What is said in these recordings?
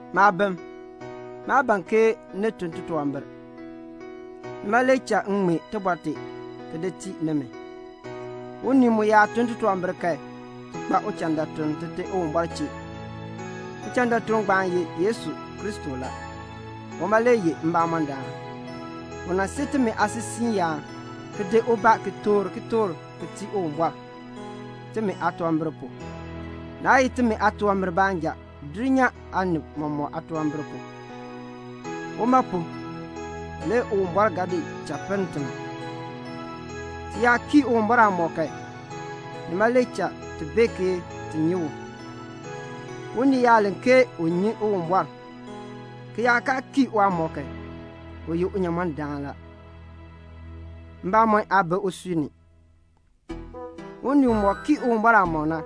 Maabim, maa ban ke ni tun titunwambir. Nima le cha m ŋmee tibɔr tee ki di tii nimi. Unii mu yaa tun titunwambir kan, ti kpa uchandaatuln Tite Uwumbɔr chee. Uchandaatuln ngbaan ye Yesu Kristo la, u ye mbamɔndaan. U nan si timi aasisiiyaan ki di ubaa ki toor kitork ki tii Uwumbɔr, timi aatunwambir pu; naa ye timi aatunwambir baanja, dulnyaa aanib mɔmɔk aatunwambir pu. Uma pu, le Uwumbɔr ga di cha pinn timi. Ti yaa kii Uwumbɔr aamɔb kan, nima le cha ti bee ke ti nyi u. Unii yaa len ke u nyi Uwumbɔr, ki yaa kaa kii waamɔb kan, u ye unyamɔndaan la; mbamɔn aa bi usui ni. Unii umɔk kii Uwumbɔr aamɔb na,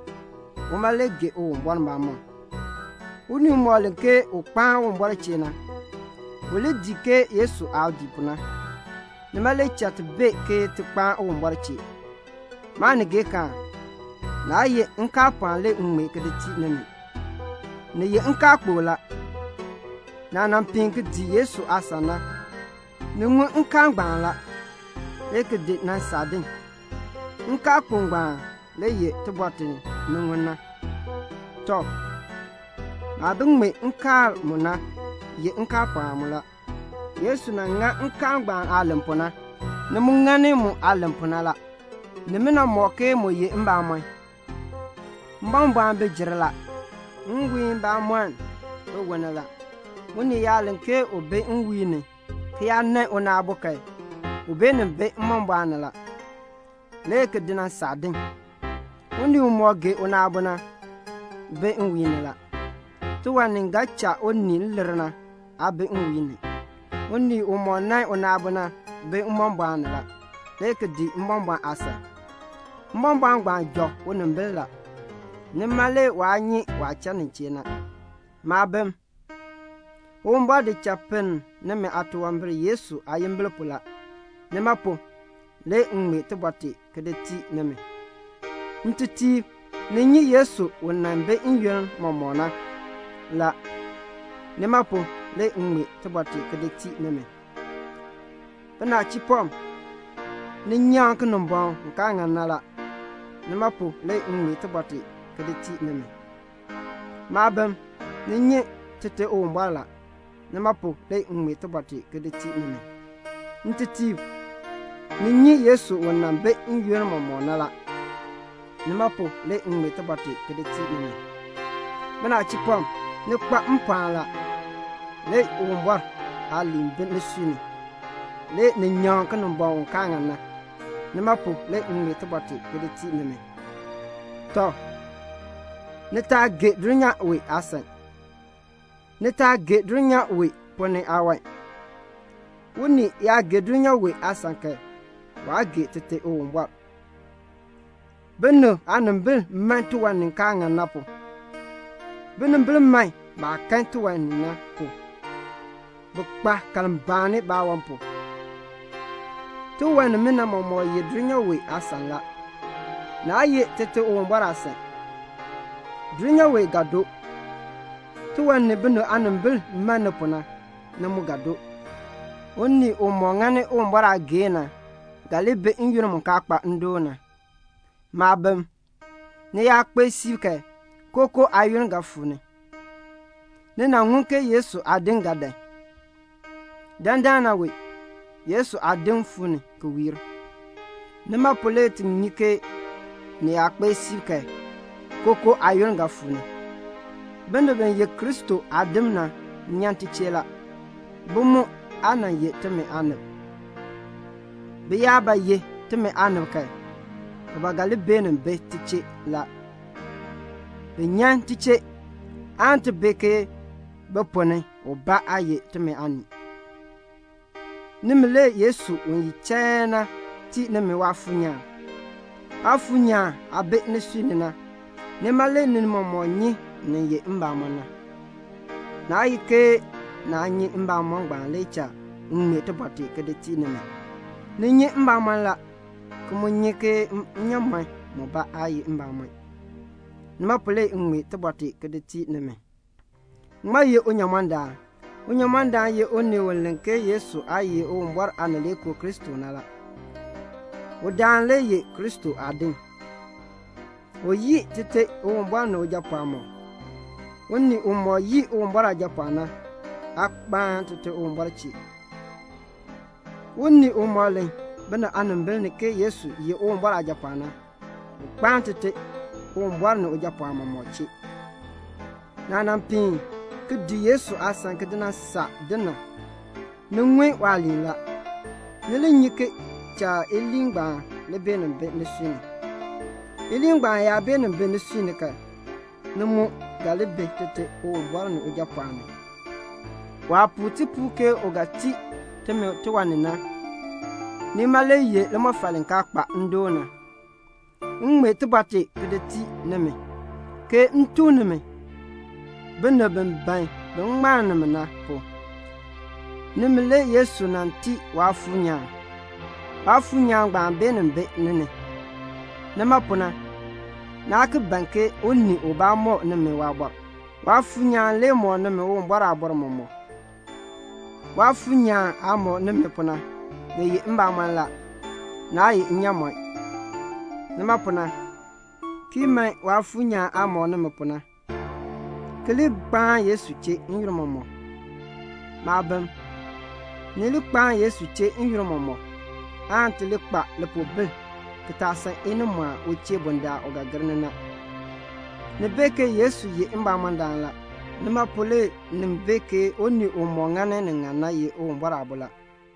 uma le gee Uwumbɔr mbamɔm. Unii umɔk len ke u kpaan Uwumbɔr chee na, u li dii ke Yesu aah dii pu na. Nima le cha ti bee ke ti kpaan Uwumbɔr chee. Maanigeekaan, naa ye nkaalpɔɔn le m ŋmee ki di tii nimi. Ni ye nkaalkpok la. Naah nan piin ki dii Yesu aasan na, ni ŋun nkaal ngbaan la, le ki di nan saa din. Nkaalkpok ngbaan le ye tibɔr ti ni ŋun na. Tɔ, maah bi ŋmee nkaal mu na, ni ye nkaalpɔɔn mu la. Yesu nan ŋa nkaal ngbaan aah len pu na. Ni mu ŋani mu aah len pu na la. Nimina mɔk ke mu ye mbamɔn. Mbɔmbɔɔn bi jer la. Nwiihn bamɔnn bi wolni la. Unii yaa len ke u bi nwiihn ni ki yaa nan una aabo kan, u beenin bi mbɔmbɔɔn ni la, le ki di nan saa din. Unii umɔk gee una aabo na bi nwiihn ni la. Tiwan ni ga cha unii lir na aa bi nwiihn ni. Unii umɔk nan una aabo na bi mbɔmbɔɔn ni la, le ki dii mbɔmbɔɔn aasan. Mbɔmbɔɔn ngbaan job unimbil la, nima le waa nyi waah cha nin chee na. Maabim, Uwumbɔr di cha pinn nimi aatunwambir Yesu aayimbil pu la. Nima pu, le m ŋmee tibɔr tee ki di tii nimi. Ntetiib, ni nyi Yesu u nan bi n-yoonn mɔmɔk na la. Nima pu le m ŋmee tibɔr tee ki di tii nimi. Binachipɔm, ni nyaŋ Kinimbɔŋ u kaa ŋan na la. Nima pu le m ŋmee tibɔr tee ki di tii nimi. Maabim, ni nyi Tite Uwumbɔr la. Nima pu le m ŋmee tibɔr tee ki di tii nimi. Ntetiib, ni nyi Yesu u nan bi n-yoonn mɔmɔk na la. Nima pu le m ŋmee tibɔr tee ki di tii nimi. Binachipɔm, ni kpa mpɔɔn la, le Uwumbɔr aaliin bi nisui ni, le ni nyaŋ Kinimbɔŋ u kaa ŋan na. Nima pu le m ŋmee tibɔr tee ki di tii nimi. Tɔ, ni taa gee dulnyaa wee aasan. Ni taa gee dulnyaa wee ponn ni aawan. Unii yaa gee dulnyaa wee aasan kan, waa gee Tite Uwumbɔr. Binib aanimbil man tiwan ni kaa ŋan na pu. Binimbil man baah kan tiwan ni na pu. Bi kpa kalmbaani baawan pu. Tiwan nimina mɔmɔk ye dulnyaa wee aasan la, naa ye Tite Uwumbɔr aasan. Dulnyaa wee ga doo. Tiwan ni binib aanimbil man ni pu na, ni mu ga doo. Unii umɔk ŋani Uwumbɔr aageehn na ga li bi n-yoonn mu kaa kpa ndoon na. Maabim, ni yaa kpee siib kan, kookoo aayoonn ga fuu ni. Ni nan ŋun ke Yesu aadin ga dan. Dandana wee Yesu aadim fuu ni ki wiir. Nima pu le ti nyi ke ni yaa kpee siib kan, kookoo aayoonn ga fuu ni. Binib bi ye Kristo aadim na nyan ti chee la. Bi mu aa nan ye timi aanib. Bi yaa ba ye timi aanib kan, bi ba ga li beenin bi ti chee la. Bi nyan ti chee, aan ti bee ke bi ponn ni ubaa aa ye timi aanii. Nimi le Yesu u ye chain na tii nimi Waafuur nyaan. Waafuur nyaan aah bi nisui ni na, nima le ni mɔmɔk nyi ni ye mbamɔn na. Naa ye ke naa nyi mbamɔn ngbaan le cha m ŋmee tibɔr tee ki di tii nimi. Ni nyi mbamɔn la, ki mu nyi ke nnyaamɔn mubaa aa ye mbamɔn. Nima pu le m ŋmee tibɔr tee ki di tii nimi. Ŋmaa ye unyamɔndaan? Unyamɔndaan ye unii u len ke Yesu aa ye Uwumbɔr Aanileekoo Kristo. Udaan le ye Kristo aadin. U yii Tite Uwumbɔr ni Ujapɔɔn mɔk. Unii umɔk yii Uwumbɔr Aajapɔɔn na aa kpaan Tite Uwumbɔr chee. Unii umɔk len binib aanimbil ni ke Yesu ye Uwumbɔr Aajapɔɔn na, u kpaan Tite Uwumbɔr ni Ujapɔɔn mɔmɔk chee. Naah nan piin ki dii Yesu aasan ki di nan saa din na, ni ŋun waaliin la. Ni li nyi ki cha iliin ngbaan li beenin bi nisui ni. Iliin ngbaan yaa beenin bi nisui ni kan, ni mu ga li bi Tite Uwumbɔr ni Ujapɔɔn ni. Waah puu tipuul ke u ga tii timi tiwan ni na, nima le ye limɔfal li kaa kpa ndoon na. M ŋmee tibɔr tee ki di tii nimi, ke m tuk nimi binib bi ban bin ŋmann nimi na pu. Nimi le Yesu nan tii Waafuur nyaan. Waafuur nyaan ngbaan beenin bi ni ni. Nima pu na, naa ki ban ke unii ubaa mɔk nimi waabɔr. Waafuur nyaan le mɔk nimi Uwumbɔr aabɔr mɔmɔk. Waafuur nyaan aah mɔk nimi pu na, ni ye mbamɔn la, naa ye nnyaamɔn. Nima pu na, kii man Waafuur nyaan aah mɔk nimi pu na, ki li kpaan Yesu chee n-yoonn mɔmɔk. Maabim, ni li kpaan Yesu chee n-yoonn mɔmɔk, aan ti li kpa lipoobil ki taa san inimɔɔn u chee bundaln u ga gir ni na. Ni bee ke Yesu ye mbamɔndaan la. Nima pu le ni bee ke unii umɔk ŋani ni ŋan na ye Uwumbɔr aabo la.